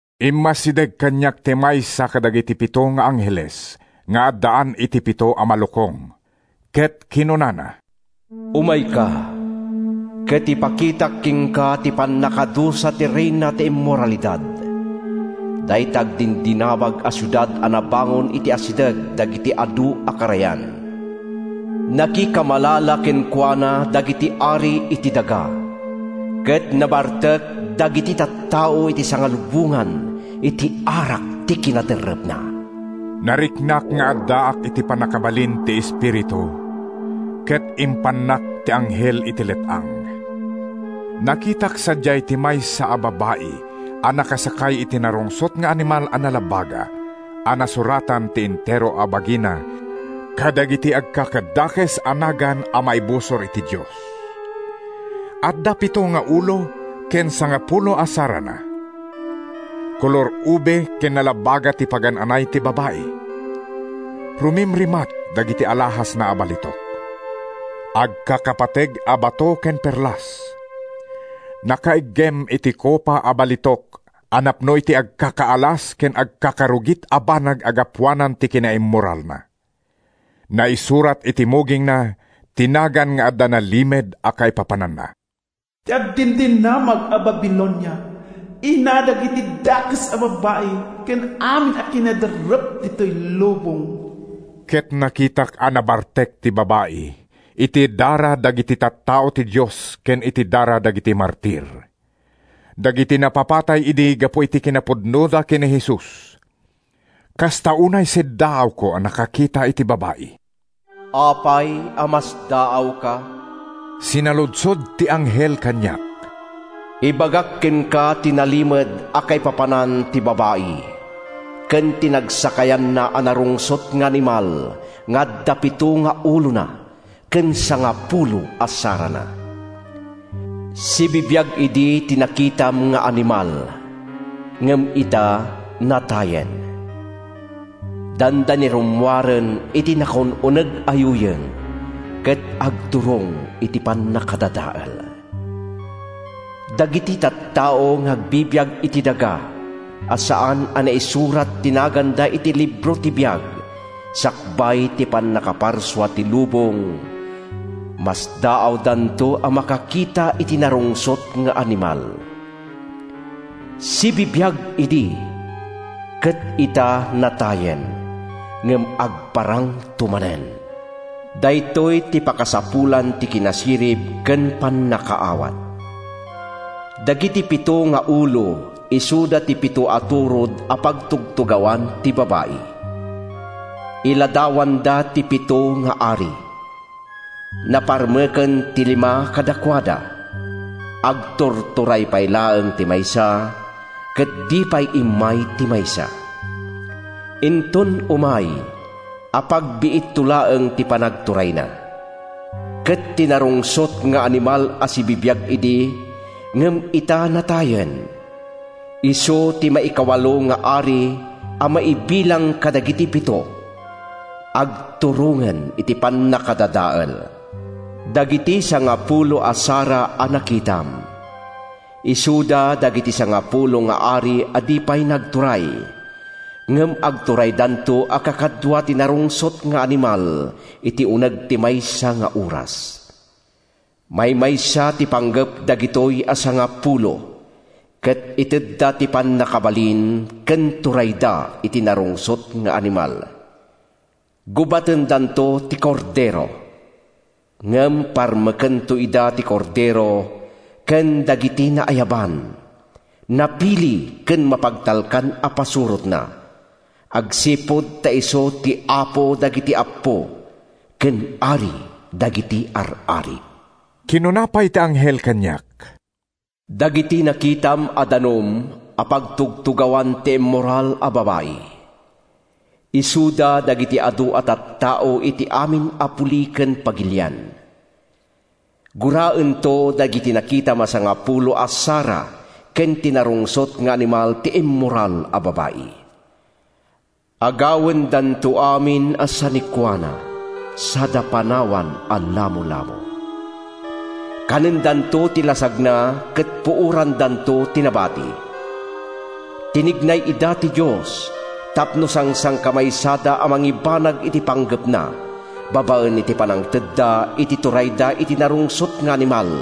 Immasideg kaniak ti maysa kadagiti pito nga angheles nga addaan iti pito a malukong ket kinunana: “Umayka, ket ipakitak kenka ti pannakadusa ti reyna ti immoralidad, dayta agdindinamag a siudad a nabangon iti asideg dagiti adu a karayan. Nakikamalala kenkuana dagiti ari iti daga, ket nabartek dagiti tattao iti sangalubongan iti arak ti kinaderrepna.” Nariknak nga addaak iti pannakabalin ti Espiritu ket impannak ti anghel iti let-ang. Nakitak sadiay ti maysa a babai a nakasakay iti narungsot nga animal a nalabaga a nasuratan ti entero a bagina kadagiti agkakadakes a nagan a maibusor iti Dios. Adda pito nga ulo ken sangapulo a sarana. Kolor ube ken nalabaga ti pagan-anay ti babai. Rumimatrimat dagiti alahasna a balitok, agkakapateg a bato ken perlas. Nakaiggem iti kopa a balitok a napno iti agkakaalas ken agkakarugit a banag a gapuanan ti kinaimmoralna. Naisurat iti mugingna ti nagan nga adda nalimed a kaipapananna: “Ti Agdindinamag a Babilonia, ina dagiti dakes a babbai ken amin a kinaderrep ditoy lubong.” Ket nakitak a nabartek ti babai iti dara dagiti tattao ti Dios ken iti dara dagiti martir—dagiti napapatay idi gapu iti kinapudnoda ken ni Jesus. Kasta unay siddaawko a nakakita iti babai. “Apay a masdaawka?” sinaludsod ti anghel kaniak. “Ibagak kenka ti nalimed a kaipapanan ti babai ken ti nagsakayanna a narungsot nga animal nga adda pito nga ulona ken sangapulo a sarana. Sibibiag idi ti nakitam nga animal ngem ita, natayen. Dandani rummuaren iti nakaun-uneg a yuyeng ket agturong iti pannakadadael. Dagiti tattao nga agbibiag iti daga a saan a naisurat ti naganda iti libro ti biag sakbay ti pannakaparsua ti lubong, masdaawdanto a makakita iti narungsot nga animal. Sibibiag idi ket ita, natayen, ngem agparangto manen. “Daytoy ti pakasapulan iti kinasirib ken pannakaawat. Dagiti pito nga ulo isuda ti pito a turod a pagtugtugawan ti babai. Iladawanda ti pito nga ari: Naparmeken ti lima kadakuada, agturturay pay laeng ti maysa, ket di pay immay ti maysa. Inton umay, apagbiitto laeng ti panagturayna. Ket ti narungsot nga animal a sibibiag idi ngem ita natayen, isu ti maikawalo nga ari a maibilang kadagiti pito—agturongen iti pannakadadael. “Dagiti sangapulo a sara a nakitam, isuda dagiti sangapulo nga ari a di pay nagturay, ngem agturaydanto a kaduada ti narungsot nga animal iti uneg ti maysa nga oras. Maymaysa ti panggep dagitoy a sangapulo, ket itedda ti pannakabalin ken turayda iti narungsot nga animal. Gubatendanto ti Kordero, ngem parmekento ida ti Kordero ken dagiti naayaban, napili ken mapagtalkan a pasurotna agsipud ta isu ti Apo dagiti appo ken Ari dagiti ar-ari.” Kinuna pay ti anghel kaniak: “Dagiti nakitam a danum a pagtugtugawan ti immoral a babai, isuda dagiti adu a tattao iti amin a puli ken pagilian. Guraento dagiti nakitam a sangapulo a sara ken ti narungsot nga animal ti immoral a babai. Agawendanto amin a sanikuana sada panawan a lamolamo. Kanendanto ti lasagna ket puorandanto ti nabati. Tinignay ida ti Dios tapno sangsangkamaysada a mangibanag iti panggepna babaen iti pannangtedda iti turayda iti narungsot nga animal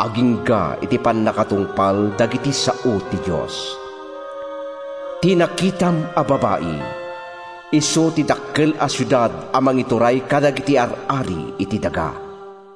agingga iti pannakatungpal dagiti sao ti Dios. “Ti nakitam a babai, isu ti dakkel a siudad a mangituray kadagiti ar-ari iti daga.”